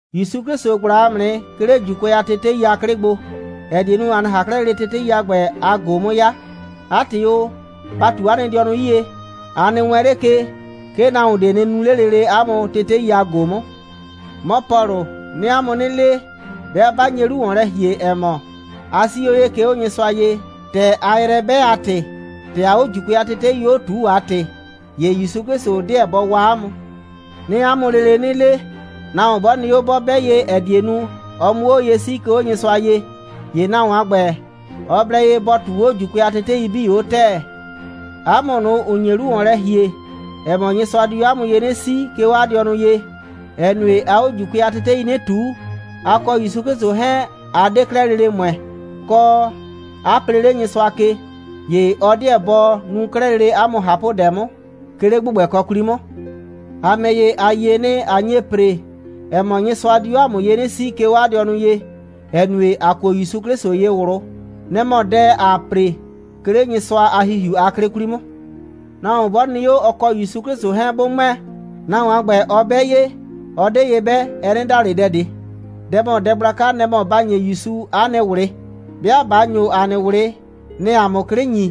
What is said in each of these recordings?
‑Yusu 'Klɩsʋ ꞊gbla ‑a mʋ nɩ, 'ke 'le ‑Juukʋɛ a tetei a 'klɩ gbo, ‑ɛ die nu, ‑a 'nɩ ꞊han 'klɛɛ lele tetei a ‑gbɛ a ꞊go 'mʋ 'ya. 'A ‑tɩ o, ba ꞊tu 'a nɩ dɩɔnʋ 'yie. A nɩ wɛɛn 'le ke, 'ke nahuon ꞊de nɩ nu 'le lele 'a mʋ tetei a ꞊go 'mʋ. 'Mɔ Pɔlʋ, 'nɩɩ 'a mʋ 'nɩ le, 'bɩa 'ba nye 'lu ‑wɔn lɛ ‑hie, ‑ɛ mɔ, a 'sii 'o ye, 'ke 'o Nyɩsʋa ye, ‑tɛ aa yrɛ 'bɛ a ‑tɩ, kɔ, ‑tɛ aa 'o ‑Juukʋɛ a tetei ‑ye 'o ꞊tuu a ‑tɩ, ‑ye ‑Yusu 'Klɩsʋ 'deɛ bɔ waa 'a mʋ. 'Nɩɩ 'a mʋ lele 'nɩ le, nahuon 'bɔ nɩ 'o, 'bɔ 'bɛ ye, ‑ɛ die nu, ɔ 'mʋ 'o ye 'sii, 'ke 'o Nyɩsʋa ye, ‑ye nahuon a ‑gbɛ, ɔ blɛ ye bɔ ꞊tuu 'o ‑Juukʋɛ a tetei 'bii 'o ‑tɛɛ. 'A mʋ ꞊nʋ, ‑ʋ nye 'lu ‑wɔn lɛ ‑hie, ‑ɛ mɔ, Nyɩsʋa di 'o 'a mʋ ye 'nɩ 'sii, 'ke 'o 'a dɩɔnʋ ye, ‑ɛ nue, aa 'o ‑Juukʋɛ a tetei 'nɩ ꞊tuu, a kɔ ‑Yusu 'Klɩsʋ 'hɛɛn, a 'de 'klɛɛ lele ‑mʋɛ, kɔ, a plee 'le Nyɩsʋa ke, ‑ye ɔ 'deɛ bɔ nu 'klɛɛ lele 'a mʋ ꞊hapʋdɛ 'mʋ, 'ke 'le ‑gbʋgbɛkɔ 'kwli 'mʋ. ‑A ‑mɛ ‑ye, ‑a yie nɩ, ꞊a nye ‑pre, ‑ɛ mɔ, Nyɩsʋa di 'o ‑a mʋ ye 'nɩ 'sii, 'ke 'o 'a dɩɔnʋ ye, ‑ɛ nue, ‑a kuo ‑Yusu 'Klɩsʋ ye ꞊wlʋ. Nɛ‑ mɔ dɛ, ‑aa ‑pre, 'ke 'le Nyɩsʋa a ‑Hihiu a 'klɩ 'kwli 'mʋ. Nahuon 'bɔ nɩ 'o, ɔ kɔ ‑Yusu 'Klɩsʋ 'hɛɛn 'bʋ ‑mʋɛ, nahuon a ‑gbɛ, ɔ 'bɛ ye, ɔ 'de ye 'bɛ, ɛ 'nɩ da ꞊le dɛ ꞊de. Dɛ ‑mɔ dɛ gblaka, nɛ‑ mɔ ‑ba ‑nye ‑Yusu ‑a nɩ ꞊wlɩ. 'Bɩa ꞊ba ‑nyo ‑a nɩ ꞊wlɩ, nɛ‑ɛ ‑a mʋ 'klɩ ‑nyi,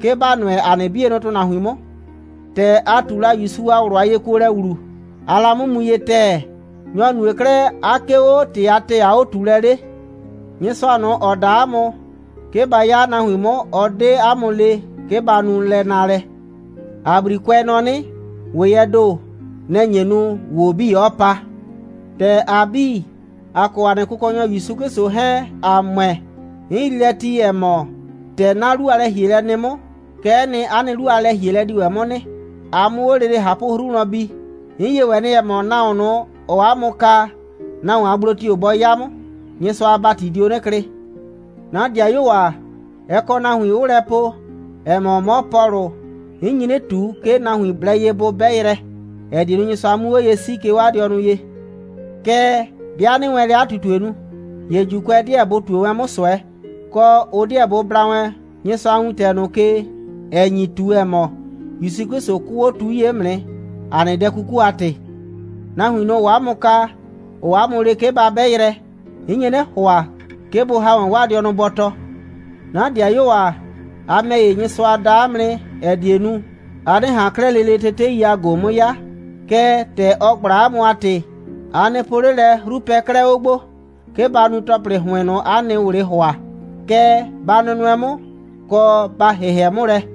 'ke ‑ba nʋɛ ‑a nɩ 'bienʋ ‑tʋnahuin 'mʋ. ‑Tɛ a ꞊tu la ‑Yusu a ꞊wlʋ a yekuolɛ ‑wlu, aa la 'mʋ mu ye ‑tɛɛ. Nyɔ‑ nue 'klɛɛ, 'a 'kee 'o ‑tɩ a ‑tɛɛ a 'o꞊tuulɛ 'le? Nyɩsʋa ꞊nʋ, ‑ɔ da 'a mʋ, 'ke ba 'ya 'a nahuin 'mʋ, ɔ 'de 'a mʋ le, 'ke ba nu lɛ naalɛ. ‑A 'brikʋɛ nɔ 'nɩ: «‑Weyɛɛ ‑do, nɛ‑ nye nu, ‑wo 'bii 'ɔɔ pa.» ‑Tɛ ‑a 'bii, ‑a kɔ ‑a nɩ Kʋkɔnyɔ ‑Yusu 'Klɩsʋ 'hɛɛn, ‑a ‑mʋɛ, 'n yrii lɛ ti, ‑ɛ mɔ, ‑tɛ 'na 'lu a lɛ‑hielɛ nɩ 'mʋ, kɛ'ɛ nɩ, 'a nɩ 'lu a lɛ‑hielɛ di ‑wɛ 'mʋ nɩ, a 'mʋ 'o lele ꞊hapʋ'hru wlɔn bi. 'N yie ‑wɛ nɩ, ‑ɛ mɔ, nahuon ꞊nʋ, ‑ɔɔ 'a mʋ kaa, nahuon a gblo tio‑ bɔ 'ya 'mʋ, Nyɩsʋa a ‑bati dio 'nɩ klɩ. 'Na ‑dɩayuo ‑a, ɛ kɔ nahuin 'ʋʋ lɛ po, ‑ɛ mɔ, 'mɔ Pɔlʋ, 'n nyi 'nɩ ꞊tu, 'ke nahuin blɛ ye bʋ 'bɛ yrɛ, ‑ɛ die nu, Nyɩsʋa 'mu 'o ye 'sii, 'ke 'o 'a dɩɔnʋ ye. Kɛɛ, 'bɩa 'nɩɩ wɛn lɛ 'a ꞊tutue nu, ‑ye ‑Juukʋɛ 'deɛ bʋ ꞊tue wɛn 'mʋ ꞊sʋɛ, kɔ, ʋ 'deɛ bʋ bla wɛn Nyɩsʋa a wintɛ ꞊nʋ ke, ‑ɛ nyi ꞊tu, ‑ɛ mɔ, ‑Yusu 'Klɩsʋ 'kʋʋ 'o tu 'yie 'mʋ nɩ, ‑a nɩ dɛ 'kuku a ‑tɩ. Nahuin ꞊nʋ, ‑ʋʋ 'a mʋ kaa, ‑ʋʋ 'a mʋ le, 'ke ba 'bɛ yrɛ, 'n nye 'nɩ ‑hʋa, 'ke bʋ ‑ha wɛn 'waa dɩɔnʋ bɔtɔ. 'Na ‑dɩayuo ‑a, a ‑mɛ ‑ye, Nyɩsʋa da 'a mʋ nɩ, ‑ɛ die nu, a 'nɩ ꞊han 'klɛɛ lele tetei a ꞊go 'mʋ 'ya. Kɛɛ, ‑tɛ ɔ ꞊gbla 'a mʋ a ‑tɩ, a nɩ po 'le lɛ, 'hru pɛ 'klɛɛ 'o gbo, 'ke ba nu ‑tɔplɩ ‑hʋɩn ꞊nʋ, 'a nɩ ꞊wlɩɩ ‑hʋa. Kɛɛ, ba nʋnʋɛ 'mʋ, kɔ, ba ‑hɩhɛ 'mʋ lɛ.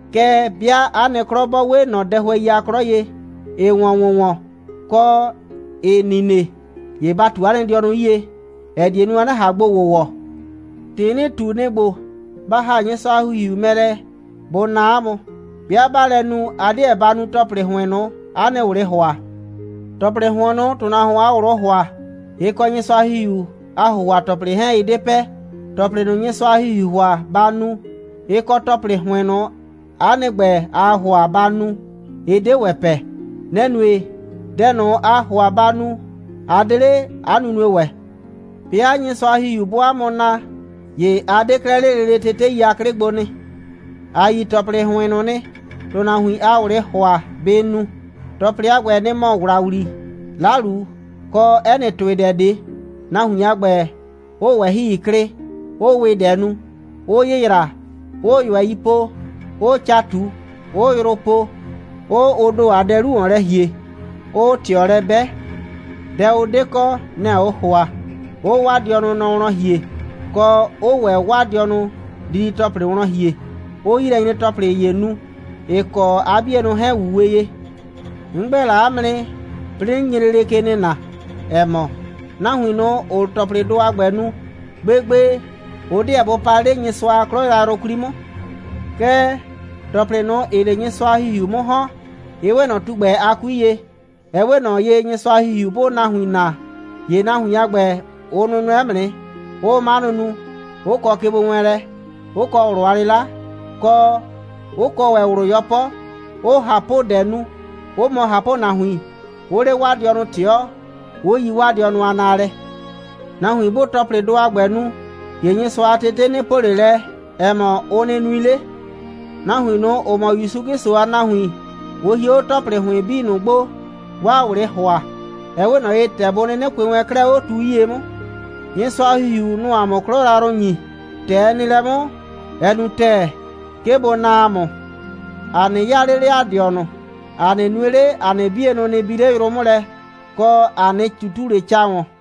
Kɛɛ, 'bɩa 'a nɩ 'klɔ 'bɔ 'we ꞊nɔ dɛhʋɛi a 'klɔ ye, ‑ɩɩ ‑wɔn ‑wʋnwɔn, kɔ, ‑ɩɩ nine, ‑ye ba ꞊tu 'a nɩ dɩɔnʋ 'yie, ‑ɛ die nu, a 'nɩ ꞊han gbo ‑wʋwɔ. ‑Tɩ 'nɩɩ ꞊tu, nɩ‑ ‑gbo: Ba ‑ha Nyɩsʋa a ‑Hihiu mɛ lɛ, bʋ naa 'a mʋ. 'Bɩa 'baa lɛ nu, a 'deɛ ba nu ‑tɔplɩ ‑hʋɩn ꞊nʋ, 'a nɩ ꞊wlɩɩ ‑hʋa. ‑Tɔplɩ ‑hʋɩn ꞊nʋ, ‑tʋnahuon a ꞊wlʋʋ ‑hʋa, ɩ kɔ Nyɩsʋa a ‑Hihiu a ‑hʋhʋa‑tɔplɩ 'hɛɛn, ɩ 'de pɛ. ‑Tɔplɩ ꞊nʋ, Nyɩsʋa a ‑Hihiuu ‑hʋa, ‑ba nu, ɩ kɔ ‑tɔplɩ ‑hʋɩn ꞊nʋ, ‑a nɩ ‑gbɛ, ‑aa ‑hʋa ‑ba nu, ɩ 'de ‑wɛ pɛ. Nɛ‑ nue, dɛ ꞊nʋ, aa ‑hʋa ba nu, 'a 'de 'le 'a nunue ‑wɛ. 'Bɩa Nyɩsʋa a ‑Hihiu 'bʋʋ 'a mʋ naa, ‑ye a 'de 'klɛɛ 'le lele tetei a 'klɩ gbo nɩ. ‑A yi ‑tɔplɩ ‑hʋɩn ꞊nʋ nɩ, ‑tʋnahuin a ꞊wlɩɩ ‑hʋa bɩ nu. ‑Tɔplɩ a ‑gbɛ, nɩ‑ mɔ ‑wlawli, 'lalu, kɔ 'ɛ nɩ ‑tʋɩdɛ ꞊de, nahuin a ‑gbɛ 'ʋʋ ꞊wɛhɩi klɩ, 'ʋʋ ‑wɩdɛ nu, 'ʋʋ yɩyraa, 'ʋʋ ꞊yʋɛi po, 'ʋʋ ca ꞊tu, 'ʋʋ yrʋ po, 'ʋʋ ʋ ‑do a dɛ 'lu ‑wɔn lɛ ‑hie, 'ʋʋ ꞊tɩɔ lɛ 'bɛ, dɛ ʋ 'de kɔ, nɛ‑ ʋʋ ‑hʋa, 'ʋʋ 'waa dɩɔnʋ nɔ wlɔn ‑hie, kɔ, 'ʋʋ ‑wɛ 'waa dɩɔnʋ didi‑tɔplɩ wlɔn ‑hie, 'ʋʋ 'yilɛnyre‑tɔplɩ ‑ye nu, ‑ɩ kɔ 'a 'bienʋ 'hɛɛn‑ 'wuwe ye. 'N ‑gbɛ la 'a mʋ nɩ, 'plɩɩ 'nɩ nye lele ke nɩna, ‑ɛ mɔ, nahuin ꞊nʋ, ‑ʋʋ ‑tɔplɩdʋ a ‑gbɛ nu, gbegbe, ʋ 'deɛ bʋ pa 'le Nyɩsʋa a 'klɔ yrayrʋ 'kwli 'mʋ. Kɛɛ, ‑tɔplɩ ꞊nʋ, ‑ɩɩ 'le Nyɩsʋa a ‑Hihiu 'mʋ ‑hɔn, ɩ 'we ꞊nɔ tugbɛ a 'kui ye. Ɛ 'we ꞊nɔ ye, Nyɩsʋa a ‑Hihiu 'bʋʋ nahuin naa, ‑ye nahuin a ‑gbɛ, ʋ nʋnʋɛ 'mʋ nɩ, 'ʋʋ 'manʋ nu, 'ʋ kɔ kegbowɛɛnlɛ, 'ʋ kɔ ꞊wlʋ a 'lɩla, kɔ, 'ʋ kɔ ‑wɛ ꞊wlʋ 'yɔpɔ, 'ʋʋ ꞊hapʋdɛ nu, 'ʋ mɔ ꞊hapʋnahuin, 'ʋʋ 'le 'waa dɩɔnʋ ꞊tɩɔ, 'ʋ yi 'waa dɩɔnʋ a naalɛ. Nahuin 'bʋʋ ‑tɔplɩdʋ a ‑gbɛ nu, ‑ye Nyɩsʋa a tetei 'nɩ po ꞊le lɛ, ‑ɛ mɔ, ʋ nɩ nui 'le. Nahuin ꞊nʋ, ‑ʋ mɔ ‑Yusu 'Klɩsʋ a nahuin, ʋ hie 'o ‑tɔplɩ ‑hʋɩn 'bii ꞊nʋ gbo, 'waa ꞊wlɩɩ ‑hʋa. Ɛ 'we ꞊nɔ ye, ‑tɛ bʋ 'nɩnɩ kʋɩ wɛn 'klɛɛ 'o tu 'yie 'mʋ. Nyɩsʋa a ‑Hihiu, nʋ‑ʋ ‑a mʋ 'klɔ yrayrʋ ‑nyi. ‑Tɛ ɛ nɩ lɛ 'mʋ, ɛ nu ‑tɛɛ, 'ke bʋ naa ‑a mʋ. ‑A 'nɩ 'yaa 'le 'le ‑a dɩɔnʋ, ‑a 'nɩ nue 'le, ‑a nɩ 'bienʋ nɩ bi 'le yrʋ 'mʋ lɛ, kɔ, ‑a 'nɩ ꞊tutu 'le ca ‑wɔn.